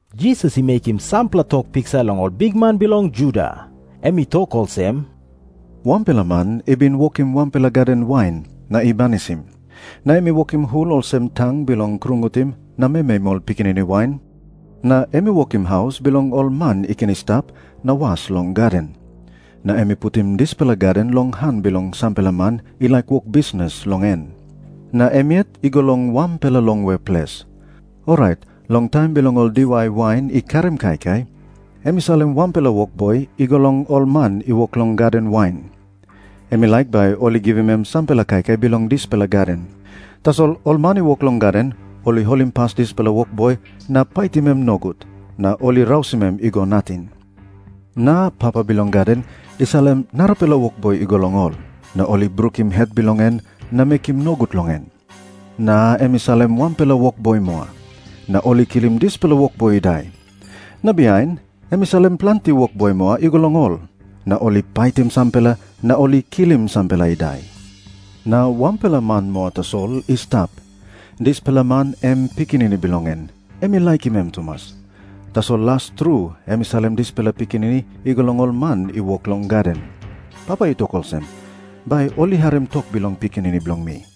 Jisas i mekim sampela tok piksa long ol bikman bilong ol Juda. Em i tok olsem, “Wanpela man i bin wokim wanpela gaden wain, na i banisim. Na em i wokim hul olsem tang bilong krungutim na memeim ol pikinini wain, na em i wokim haus bilong ol man i ken i stap na was long gaden. Na em i putim dispela gaden long han bilong sampela man i laik wok bisnis long en. Na em yet i go long wanpela longwe ples. Orait long taim bilong ol diwai wain i karim kaikai, em i salim wanpela wokboi i go long ol man i wok long gaden wain. Em i laik bai ol i givim em sampela kaikai bilong dispela gaden. Tasol ol man i wok long gaden ol i holimpas dispela wokboi na paitim em nogut, na ol i rausim em i go nating. Na papa bilong gaden i salim narapela wokboi i go long ol. Na ol i brukim het bilong en na mekim nogut long en. Na em i salim wanpela wokboi moa. Na ol i kilim dispela wokboi i dai. Na bihain em i salim planti wokboi moa i go long ol. Na ol i paitim sampela, na ol i kilim sampela i dai. Na wanpela man moa tasol i stap. Dispela man em pikinini bilong en, em i laikim tumas. Tasol las tru em i salim dispela pikinini i go long ol man i wok long gaden. Papa i tok olsem, ‘Bai ol i harim tok bilong pikinini bilong mi.’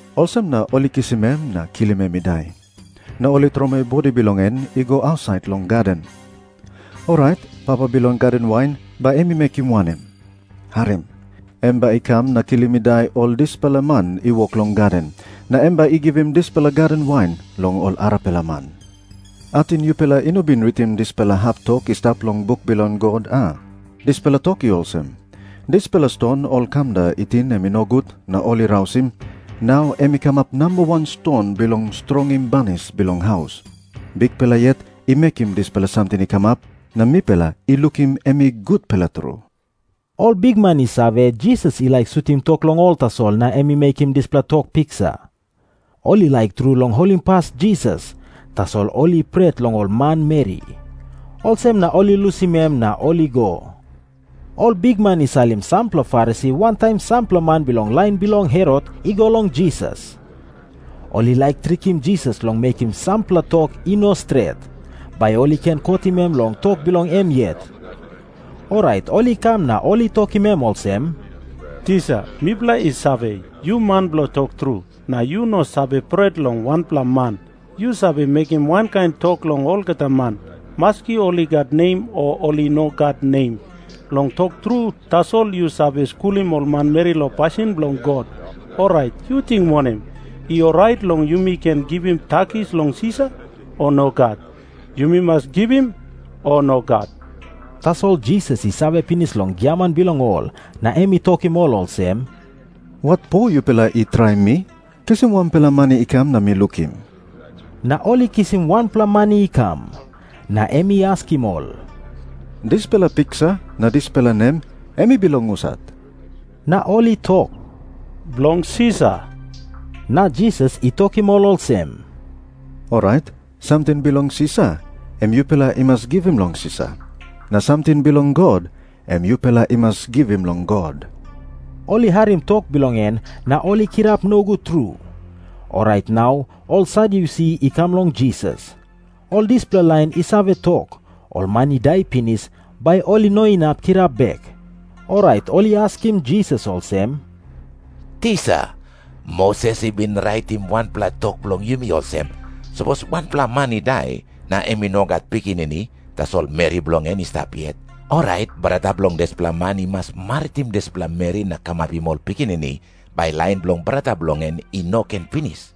Olsem na ol i kisim em na kilim em i dai. Na ol i tromoi bodi bilong en i go ausait long gaden. “Orait papa bilong gaden wain bai em i mekim wanem? Harim. Em bai i kam na kilim i dai ol dispela man i wok long gaden. Na em bai i givim dispela gaden wain long ol arapela man. “Ating yupela i no bin ritim dispela hap tok i stap long buk bilong God, a? Dispela tok i olsem, ‘Dispela ston ol kamda i ting em i nogut na ol i rausim, nau em i kamap nambawan ston bilong strongim banis bilong haus. Bikpela yet i mekim dispela samting i kamap, na mipela i lukim em i gutpela tru.’” Ol bikman i save, Jisas i laik sutim tok long ol tasol na em i mekim dispela tok piksa. Ol i laik tru long holimpas Jisas, tasol ol i pret long ol manmeri. Olsem na ol i lusim em na ol i go. Ol bikman i salim sampela Farisi wantaim sampela man bilong lain bilong Herot i go long Jisas. Ol i laik trikim Jisas long mekim sampela tok i no stret, bai ol i ken kotim em long tok bilong em yet. Orait ol i kam na ol i tokim em olsem, “Tisa, mipela i save, yu man bilong tok tru. Na yu no save pret long wanpela man. Yu save mekim wankain tok long olgeta man, maski ol i gat nem o ol i no gat nem. Long tok tru tasol yu save skulim ol manmeri long pasin bilong God. Orait, yu ting wanem? I orait long yumi ken givim takis long Sisar, o nogat? Yumi mas givim, o nogat?” Tasol Jisas i save pinis long giaman bilong ol, na em i tokim ol olsem, “Watpo yupela i traim mi? Kisim wanpela mani i kam na mi lukim.” Na ol i kisim wanpela mani i kam. Na em i askim ol, “Dispela piksa na dispela nem em i bilong husat?” Na ol i tok, “Bilong Sisar.” Na Jisas i tokim ol olsem, “Orait samting bilong Sisar, em yupela i mas givim long Sisar. Na samting bilong God, em yupela i mas givim long God.” Ol i harim tok bilong en na ol i kirap nogut tru. Orait nau ol Sadyusi i kam long Jisas. Ol dispela lain i save tok, ol man i dai pinis, bai ol i no inap kirap bek. Orait ol i askim Jisas olsem, “Tisa, Moses i bin raitim wanpela tok bilong yumi olsem. Sapos wanpela man i dai, na em i no gat pikinini, tasol meri bilong en i stap yet, orait brata bilong dispela man i mas maritim dispela meri na kamapim ol pikinini, bai lain bilong brata bilong en i no ken pinis.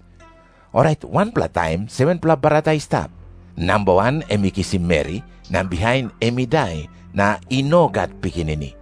Orait wanpela taim 7-pela brata i stap. Namba wan em i kisim meri, na bihain em i dai, na i no gat pikinini.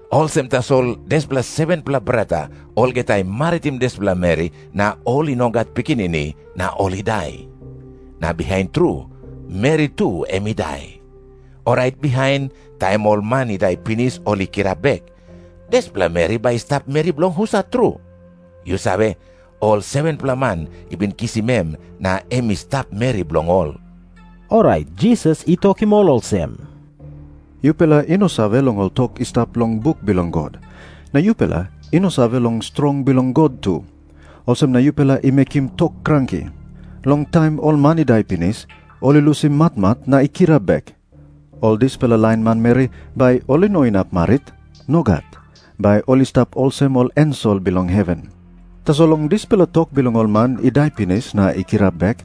Olsem tasol dispela 7-pela brata olgeta ol i maritim dispela meri, na ol i no gat pikinini, na ol i dai. Na bihain tru, meri tu em i dai. Orait bihain, taim ol man i dai pinis ol i kirap bek, dispela meri bai i stap meri bilong husat tru? Yu save, ol 7-pela man i bin kisim em na em i stap meri bilong ol.” Orait Jisas i tokim ol olsem, “Yupela i no save long ol tok i stap long buk bilong God. Na yupela i no save long strong bilong God tu. Olsem na yupela i mekim tok kranki. Long taim ol man i dai pinis, ol i lusim matmat na i kirap bek, ol dispela lain manmeri bai ol i no inap marit. Nogat. Bai ol i stap olsem ol ensel bilong heven. “Tasol long dispela tok bilong ol man i dai pinis na i kirap bek,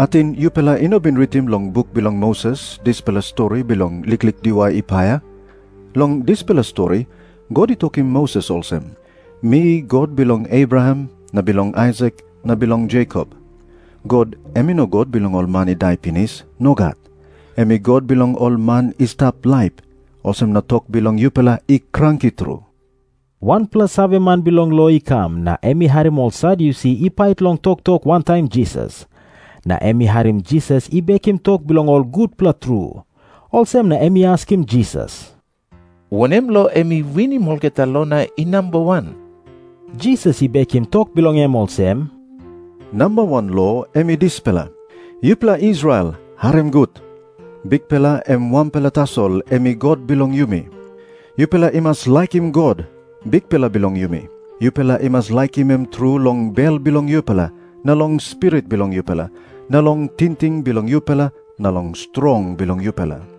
ating yupela i no bin ritim long buk bilong Moses dispela stori bilong liklik diwai i paia? Long dispela stori God i tokim Moses olsem, ‘Mi God bilong Abraham na bilong Aisak na bilong Jekop.’ God em i no God bilong ol man i dai pinis. Nogat. Em i God bilong ol man i stap laip. Olsem na tok bilong yupela i kranki tru!” Wanpela saveman bilong lo i kam, na em i harim ol Sadyusi i pait long toktok wantaim Jisas. Na em i harim Jisas i bekim tok bilong ol gutpela tru. Olsem na em i askim Jisas, “Wanem lo em i winim olgeta lo na i namba wan?” Jisas i bekim tok bilong em olsem, “Namba wan lo em i dispela, ‘Yupela Israel, harim gut. Bikpela em wanpela tasol em i God bilong yumi. Yupela i mas laikim God, Bikpela bilong yumi. Yupela i mas laikim em tru long bel bilong yupela na long spirit bilong yupela na long tingting bilong yupela na long strong bilong yupela.’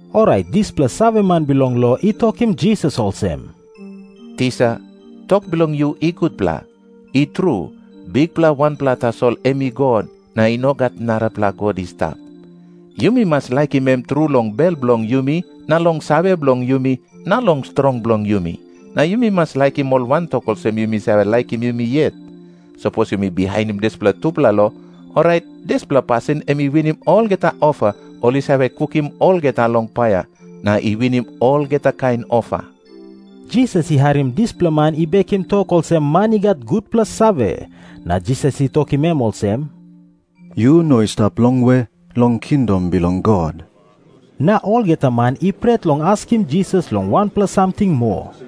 Orait dispela saveman bilong lo i tokim Jisas olsem, “Tisa, tok bilong yu i gutpela. I tru, Bikpela wanpela tasol em i God, na i no gat narapela God i stap. Yumi mas laikim em tru long bel bilong yumi na long save bilong yumi na long strong bilong yumi. Na yumi mas laikim ol wantok olsem yumi save laikim yumi yet. Sapos yumi bihainim dispela tupela lo, orait dispela pasin em i winim olgeta ofa ol i save kukim olgeta long paia, na i winim olgeta kain ofa.” Jisas i harim dispela man i bekim tok olsem man i gat gutpela save, na Jisas i tokim em olsem, “Yu no i stap longwe long kingdom bilong God.” Na olgeta man i pret long askim Jisas long wanpela samting moa.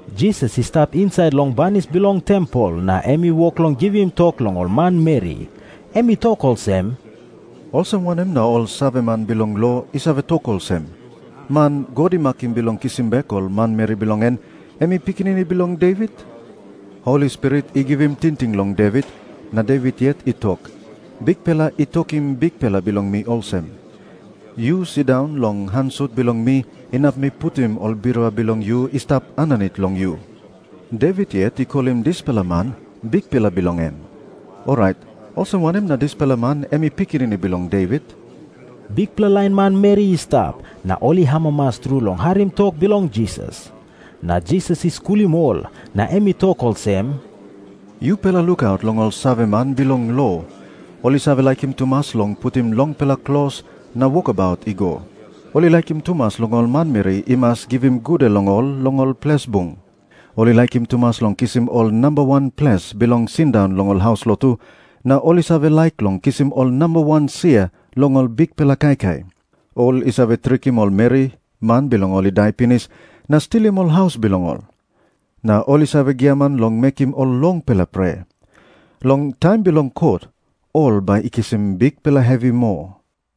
Jisas i stap insait long banis bilong tempel na em i wok long givim tok long ol manmeri. Em i tok olsem, “Olsem wanem na ol saveman bilong lo i save tok olsem, man God i makim bilong kisim bek ol manmeri bilong en, em i pikinini bilong Devit? Holi Spirit i givim tingting long Devit, na Devit yet i tok, ‘Bikpela i tokim Bikpela bilong mi olsem, “Yu sindaun long han sut bilong mi inap mi putim ol birua bilong yu i stap aninit long yu.” ’ Devit yet i kolim dispela man Bikpela bilong em. Orait olsem wanem na dispela man em i pikinini bilong Devit?” Bikpela lain manmeri i stap, na ol i amamas tru long harim tok bilong Jisas. Na Jisas i skulim ol, na em i tok olsem, “Yupela lukaut long ol saveman bilong lo. Ol i save laikim tumas long putim longpela klos na wokabaut i go. Ol i laikim tumas long ol manmeri i mas givim gude long ol long ol ples bung. Ol i laikim tumas long kisim ol namba wan ples bilong sindaun long ol haus lotu, na ol i save laik long kisim ol namba wan sia long ol bikpela kaikai. Ol i save trikim ol meri, man bilong ol i dai pinis, na stilim ol haus bilong ol. Na ol i save giaman long mekim ol longpela prea. Long taim bilong kot ol bai i kisim bikpela hevi moa.”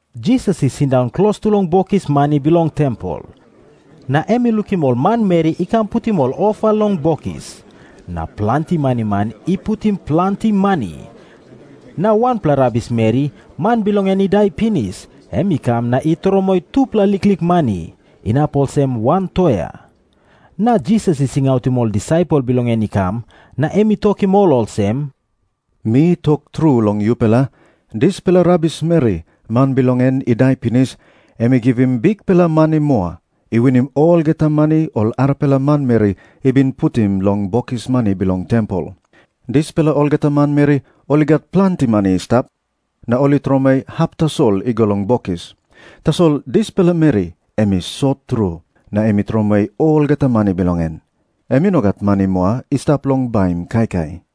Jisas i sindaun klostu long bokis mani bilong tempel. Na em i lukim ol manmeri i kam putim ol ofa long bokis. Na planti maniman i putim planti mani. Na wanpela rabismeri, man bilong en i dai pinis, em i kam na i tromoi tupela liklik mani, inap olsem wan toea. Na Jisas i singautim ol disaipel bilong en i kam, na em i tokim ol olsem, “Mi tok tru long yupela, dispela rabismeri, man bilong en i dai pinis, em i givim bikpela mani moa, i winim olgeta mani ol arapela manmeri i bin putim long bokis mani bilong tempel. Dispela olgeta manmeri ol i gat planti mani i stap, na ol i tromoi hap tasol i go long bokis. Tasol dispela meri em i sot tru, na em i tromoi olgeta mani bilong en. Em i no gat mani moa i stap bilong baim kaikai.”